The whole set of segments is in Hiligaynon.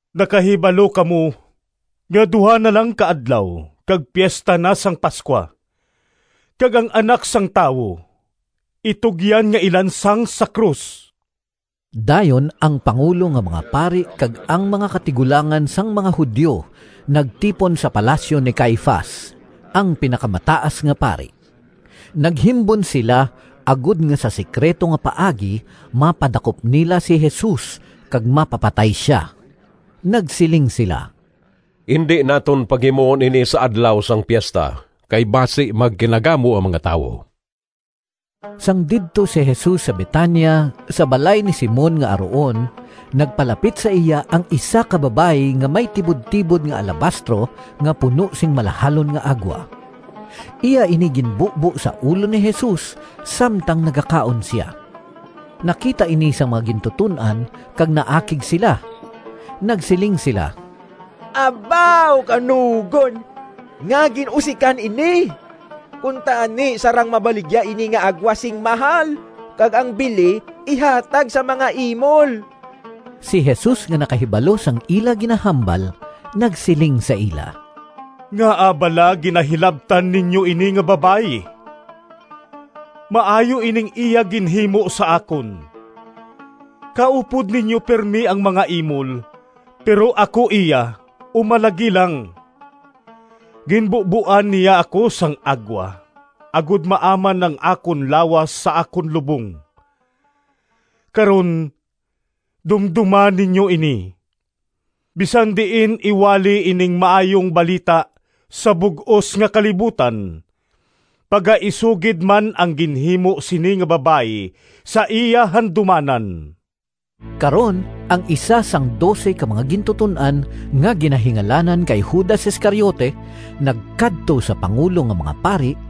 “Nakahibalo kamo nga duha na lang ka adlaw kag Piesta na sang Pascua, kag ang Anak sang Tawo itugyan nga ilansang sa krus.” Dayon ang pangulo nga mga pari kag ang mga katigulangan sang mga Judio nagtipon sa palasyo ni Caifas, ang Pinakamataas nga Pari. Naghimbon sila agod nga sa sekrito nga paagi mapadakop nila si Jesus kag mapapatay sia. Nagsiling sila, “Indi naton paghimuon ini sa adlaw sang piesta, kay basi magkinagamo ang mga tawo.” Sang didto si Jesus sa Betania, sa balay ni Simon nga aruon, nagpalapit sa iya ang isa ka babayi nga may tibudtibod nga alabastro nga puno sing malahalon nga agwa. Iya ini ginbubo sa ulo ni Jesus samtang nagakaon sia. Nakita ini sang mga gintuton-an kag naakig sila. Nagsiling sila, “Abaw kanugon! Ngaa gin-usikan ini? Kuntani sarang mabaligya ini nga agwa sing mahal kag ang bili ihatag sa mga imol!” Si Jesus nga nakahibalo sang ila ginahambal nagsiling sa ila, “Ngaa bala ginahilabtan ninyo ini nga babayi? Maayo ining iya ginhimo sa akon. Kaupod ninyo pirme ang mga imol, pero ako iya umalagi lang. Ginbuboan niya ako sang agwa agod maaman ang akon lawas sa akon lubong. Karon dumdoma ninyo ini! Bisan diin iwali ining Maayong Balita sa bug-os nga kalibutan, pagaisugid man ang ginhimo sini nga babayi sa iya handumanan.” Karon ang isa sang dose ka mga gintuton-an nga ginahingalanan kay Judas Iscariote nagkadto sa pangulo nga mga pari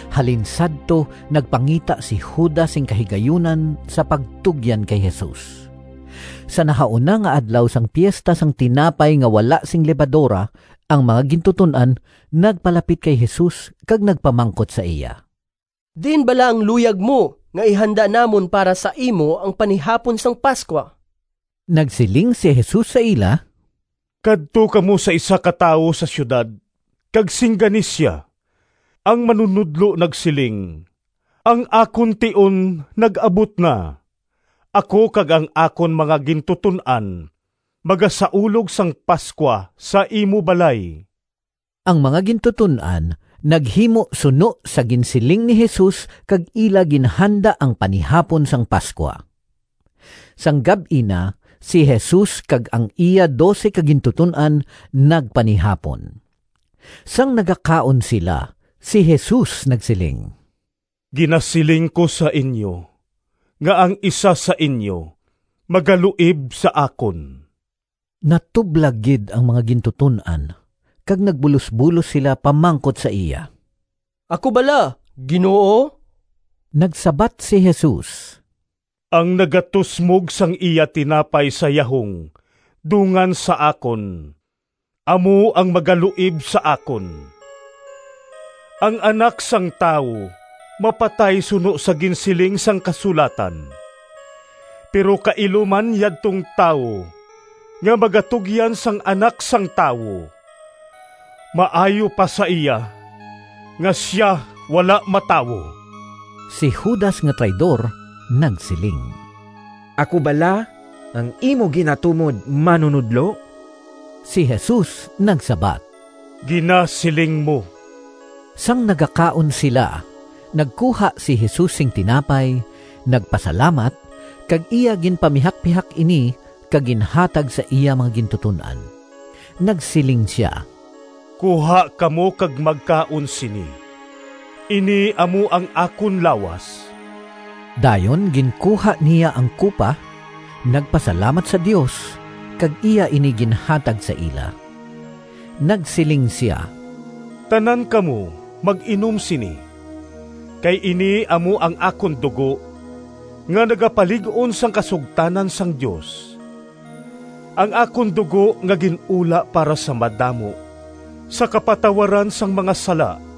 Halin sadto nagpangita si Judas sing kahigayunan sa pagtugyan kay Jesus. Sa nahauna nga adlaw sang Piesta sang Tinapay nga wala sing Lebadora, ang mga gintuton-an nagpalapit kay Jesus kag nagpamangkot sa iya, “Diin bala ang luyag mo nga ihanda namon para sa imo ang panihapon sang Pascua?” Nagsiling si Jesus sa ila, “Kadto kamo sa isa ka tawo sa siyudad, kag singgani sia, ‘Ang Manunodlo nagsiling, Ang akon tion nag-abot na. Ako kag ang akon mga gintuton-an magasaulog sang Pascua sa imo balay.’” Ang mga gintuton-an naghimo suno sa ginsiling ni Jesus kag ila ginhanda ang panihapon sang Pascua. Sang gab-i na, si Jesus kag ang iya dose ka gintuton-an nagpanihapon. Sang nagakaon sila, si Jesus nagsiling, “Ginasiling ko sa inyo nga ang isa sa inyo magaluib sa akon.” Natublag gid ang mga gintuton-an kag nagbulosbulos sila pamangkot sa iya, “Ako bala, Ginoo?” Nagsabat si Jesus, “Ang nagatusmog sang iya tinapay sa yahong dungan sa akon amo ang magaluib sa akon. Ang Anak sang Tawo mapatay suno sa ginsiling sang Kasulatan, pero kailo man yadtong tawo nga magatugyan sang Anak sang Tawo! Maayo pa sa iya nga sia wala matawo!” Si Judas nga traidor nagsiling, “Ako bala ang imo ginatumod, Manunodlo?” Si Jesus nagsabat, “Ginasiling mo.” Sang nagakaon sila, nagkuha si Jesus sing tinapay, nagpasalamat, kag iya ginpamihakpihak ini kag ginhatag sa iya mga gintuton-an. Nagsiling sia, “Kuha kamo, kag magkaon sini. Ini amo ang akon lawas.” Dayon ginkuha niya ang kupa, nagpasalamat sa Dios, kag iya ini ginhatag sa ila. Nagsiling sia, “Tanan kamo mag-inom sini, kay ini amo ang akon dugo, nga nagapalig-on sang kasugtanan sang Dios, ang akon dugo nga gin-ula para sa madamo sa kapatawaran sang mga sala.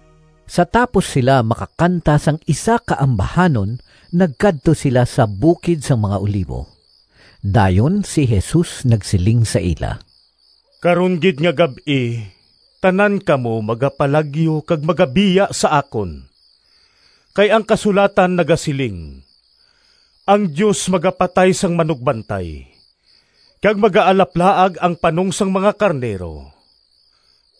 Sa tapos sila makakanta sang isa ka ambahanon nagkadto sila sa bukid sang mga Olivo. Dayon si Jesus nagsiling sa ila, “Karon gid nga gab-i tanan kamo magapalagyo kag magabiya sa akon, kay ang kasulatan nagasiling, ‘Ang Dios magapatay sang manugbantay, kag magaalaplaag ang panong sang mga karnero.’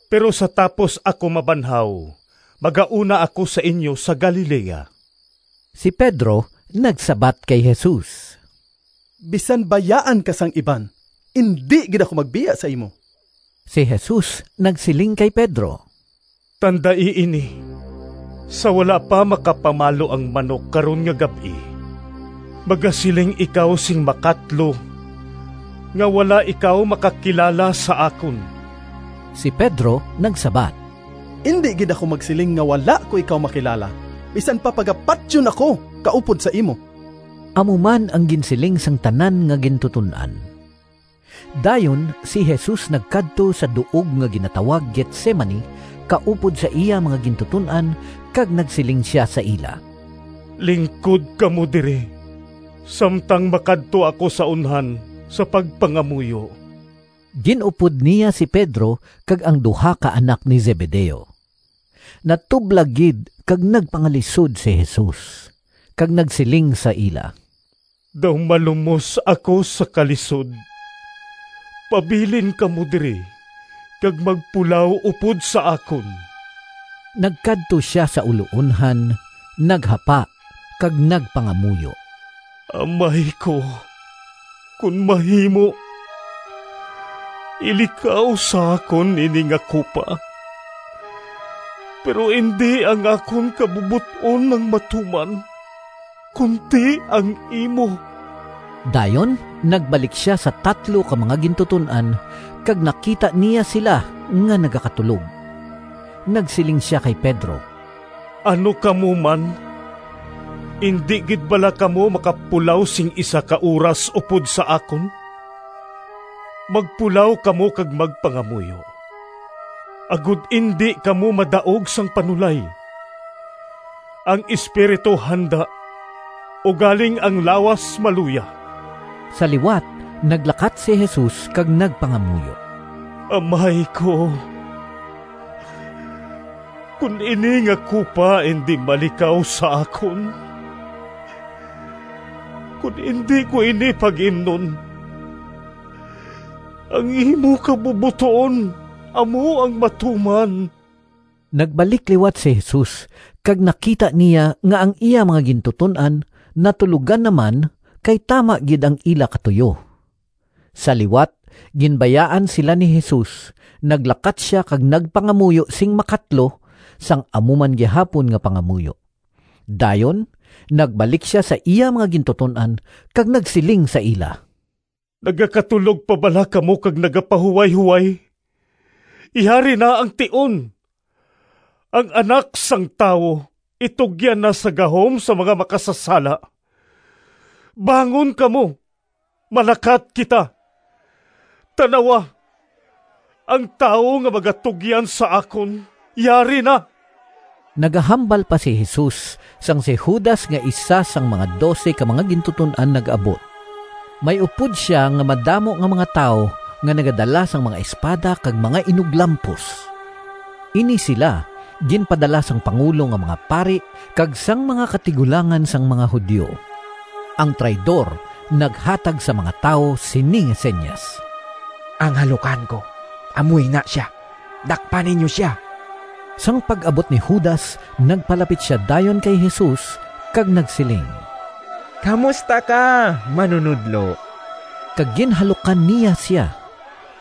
Pero sa tapos ako mabanhaw, magauna ako sa inyo sa Galilea.” Si Pedro nagsabat kay Jesus, “Bisan bayaan ka sang iban, indi gid ako magbiya sa imo!” Si Jesus nagsiling kay Pedro, “Tandai ini! Sa wala pa makapamalo ang manok karon nga gab-i magasiling ikaw sing makatlo nga wala ikaw makakilala sa akon.” Si Pedro nagsabat, “Indi gid ako magsiling nga wala ko ikaw makilala, bisan pa pagapatyon ako kaupod sa imo!” Amo man ang ginsiling sang tanan nga gintuton-an. Dayon si Jesus nagkadto sa duog nga ginatawag Getsemani kaupod sa iya mga gintuton-an, kag nagsiling sia sa ila, “Lingkod kamo diri samtang makadto ako sa unhan sa pagpangamuyo.” Gin-upod niya si Pedro kag ang duha ka anak ni Zebedeo. Natublag gid kag nagpangalisod si Jesus, kag nagsiling sa ila, “Daw malumos ako sa kalisod. Pabilin kamo diri kag magpulaw upod sa akon.” Nagkadto sia sa uloonhan, naghapa kag nagpangamuyo, “Amay ko, kon mahimo, ilikaw sa akon ini nga kupa! Pero indi ang akon kabubot-on ang matuman, kundi ang imo.” Dayon nagbalik sia sa tatlo ka mga gintuton-an kag nakita niya sila nga nagakatulog. Nagsiling sia kay Pedro, “Ano kamo man! Indi gid bala kamo makapulaw sing isa ka oras upod sa akon? Magpulaw kamo kag magpangamuyo, agod indi kamo madaog sang panulay. Ang espiritu handa ugaling ang lawas maluya.” Sa liwat naglakat si Jesus kag nagpangamuyo, “Amay ko, kon ini nga kupa indi malikaw sa akon, kon indi ko ini pag-imnon, ang imo kabubot-on amo ang matuman.” Nagbalik liwat si Jesus kag nakita niya nga ang iya mga gintuton-an natulogan naman, kay tama gid ang ila katuyo. Sa liwat ginbayaan sila ni Jesus, naglakat sia kag nagpangamuyo sing makatlo, sang amo man gihapon nga pangamuyo. Dayon nagbalik sia sa iya mga gintuton-an kag nagsiling sa ila, “Nagakatulog pa bala kamo kag nagapahuwayhoway? Yari na ang tion! Ang Anak sang Tawo itugyan na sa gahom sang mga makasasala. Bangon kamo, malakat kita. Tan-awa, ang tawo nga magatugyan sa akon yari na!” Nagahambal pa si Jesus sang si Judas nga isa sang mga dose ka mga gintuton-an nag-abot. May upod sia nga madamo nga mga tawo nga nagadala sang mga espada kag mga inuglampos. Ini sila ginpadala sang pangulo nga mga pari kag sang mga katigulangan sang mga Judio. Ang traidor naghatag sa mga tawo sini nga sinyas, “Ang halukan ko amo ina sia. Dakpa ninyo sia!” Sang pag-abot ni Judas nagpalapit sia dayon kay Jesus kag nagsiling, “Kamusta ka, Manunodlo,” kag ginhalukan niya sia.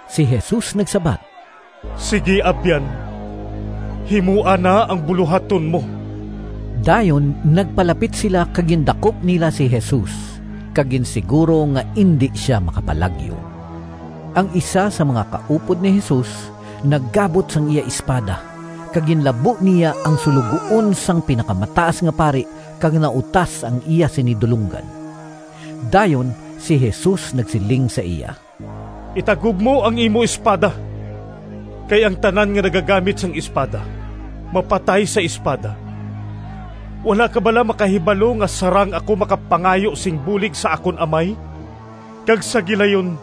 Si Jesus nagsabat, “Sigi abyan, himoa na ang bulohaton mo!” Dayon nagpalapit sila kag gindakop nila si Jesus kag ginsiguro nga indi sia makapalagyo. Ang isa sang mga kaupod ni Jesus naggabot sang iya espada kag ginlabo niya ang suloguon sang Pinakamataas nga Pari kag nautas ang iya sini dulonggan. Dayon si Jesus nagsiling sa iya, “Itagob mo ang imo espada, kay ang tanan nga nagagamit sang espada mapatay sa espada. Wala ka bala makahibalo nga sarang ako makapangayo sing bulig sa akon Amay kag sa gilayon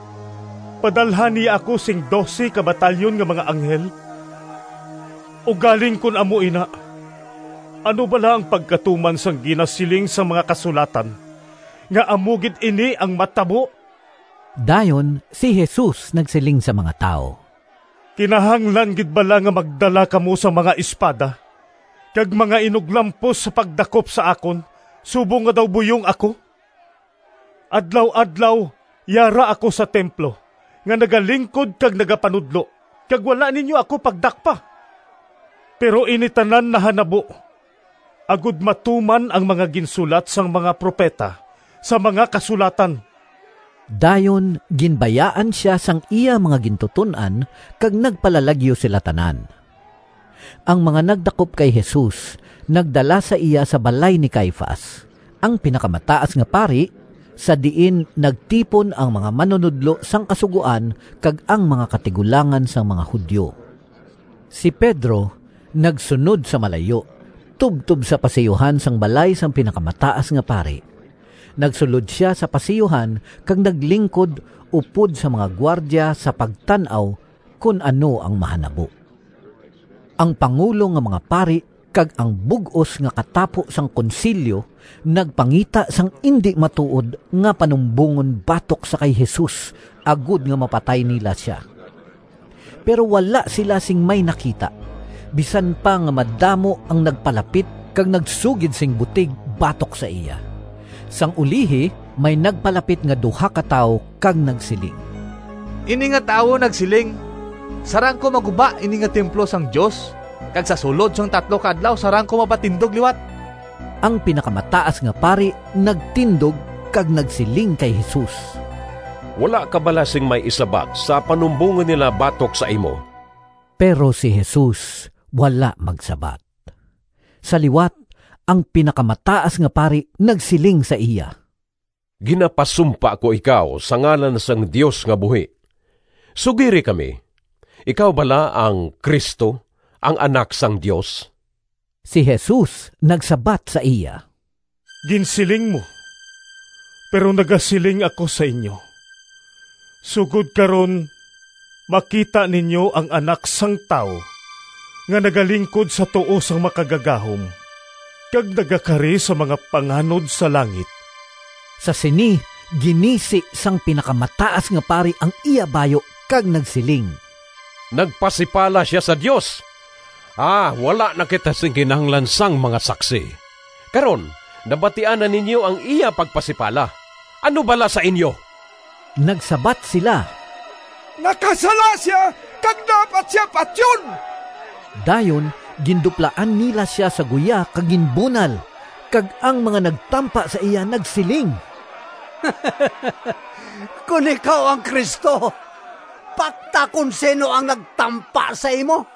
padalhan niya ako sing dose ka batalyon nga mga anghel? Ugaling kon amo ina, ano bala ang pagkatuman sang ginasiling sang mga Kasulatan nga amo gid ini ang matabo?” Dayon si Jesus nagsiling sa mga tawo, “Kinahanglan gid bala nga magdala kamo sang mga espada kag mga inuglampos sa pagdakop sa akon, subong nga daw buyong ako? Adlaw-adlaw yara ako sa templo nga nagalingkod kag nagapanudlo, kag wala ninyo ako pagdakpa. Pero ini tanan nahanabo agod matuman ang mga ginsulat sang mga propeta sa mga Kasulatan.” Dayon ginbayaan sia sang iya mga gintuton-an, kag nagpalalagyo sila tanan. Ang mga nagdakop kay Jesus nagdala sa iya sa balay ni Caifas, ang Pinakamataas nga Pari, sa diin nagtipon ang mga manunodlo sang Kasugoan kag ang mga katigulangan sang mga Judio. Si Pedro nagsunod sa malayo, tubtob sa pasiyuhan sang balay sang Pinakamataas nga Pari. Nagsulod sia sa pasiyuhan kag naglingkod upod sa mga gwardya sa pagtan-aw kon ano ang mahanabo. Ang pangulo nga mga pari kag ang bug-os nga katapo sang konsilyo nagpangita sang indi matuod nga panumbongon batok sa kay Jesus agod nga mapatay nila sia; pero wala sila sing may nakita, bisan pa nga madamo ang nagpalapit kag nagsugid sing butig batok sa iya. Sang ulihi may nagpalapit nga duha ka tawo kag nagsiling, “Ini nga tawo nagsiling, ‘Sarang ko maguba ini nga templo sang Dios kag sa sulod sang tatlo ka adlaw sarang ko mapatindog liwat.’” Ang Pinakamataas nga Pari nagtindog kag nagsiling kay Jesus, “Wala ka bala sing may isabat sa panumbongon nila batok sa imo?” Pero si Jesus wala magsabat. Sa liwat ang Pinakamataas nga Pari nagsiling sa iya, “Ginapasumpa ko ikaw sa ngalan sang Dios nga buhi: sugiri kami, ikaw bala ang Cristo, ang Anak sang Dios?” Si Jesus nagsabat sa iya, “Ginsiling mo. Pero nagasiling ako sa inyo: sugod karon makita ninyo ang Anak sang Tawo nga nagalingkod sa tuo sang Makagagahom, kag nagakari sa mga panganod sa langit!” Sa sini, ginisi sang Pinakamataas nga Pari ang iya bayu kag nagsiling, “Nagpasipala sia sa Dios! Wala na kita sing kinahanglan sang mga saksi! Karon, nabatian na ninyo ang iya pagpasipala! Ano bala sa inyo?” Nagsabat sila, “Nakasala sia, kag dapat sia patyon.” Dayon ginduplaan nila sia sa guya kag ginbunal, kag ang mga nagtampa sa iya nagsiling, “Kon ikaw ang Cristo, pakta kon sin-o ang nagtampa sa imo!”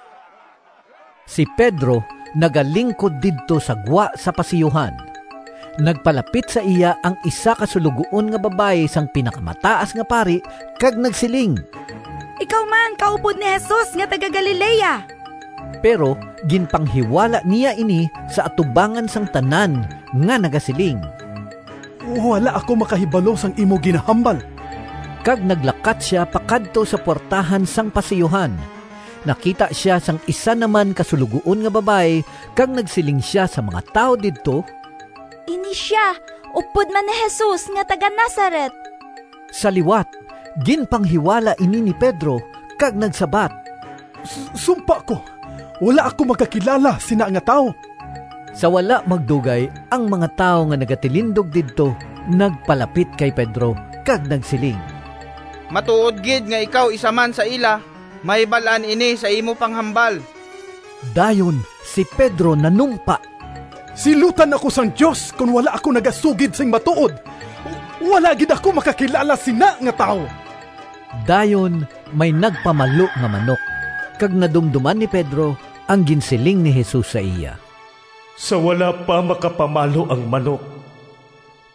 Si Pedro nagalingkod didto sa gwa sa pasiyuhan. Nagpalapit sa iya ang isa ka suloguon nga babayi sang Pinakamataas nga Pari kag nagsiling, “Ikaw man kaupod ni Jesus nga taga-Galilea.” Pero ginpanghiwala niya ini sa atubangan sang tanan nga nagasiling, “Wala ako makahibalo sang imo ginahambal.” Kag naglakat sia pakadto sa puwertahan sang pasiyuhan. Nakita sia sang isa naman ka suloguon nga babayi kag nagsiling sia sa mga tawo didto, “Ini sia upod man ni Jesus nga taga-Nazaret.” Sa liwat ginpanghiwala ini ni Pedro, kag nagsabat, “Sumpa ko, wala ako makakilala sina nga tawo!” Sa wala madugay, ang mga tawo nga nagatilindog didto nagpalapit kay Pedro kag nagsiling, “Matuod gid nga ikaw isa man sa ila. Mahibal-an ini sa imo panghambal!” Dayon si Pedro nanumpa: “Silutan ako sang Dios kon wala ako nagasugid sing matuod! Wala gid ako makakilala sina nga tawo!” Dayon may nagpamalo nga manok, kag nadumdoman ni Pedro ang ginsiling ni Jesus sa iya, “Sa wala pa makapamalo ang manok,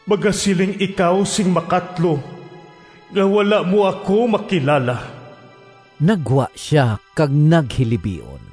magasiling ikaw sing makatlo nga wala mo ako makilala.” Naggwa sia kag naghilibion.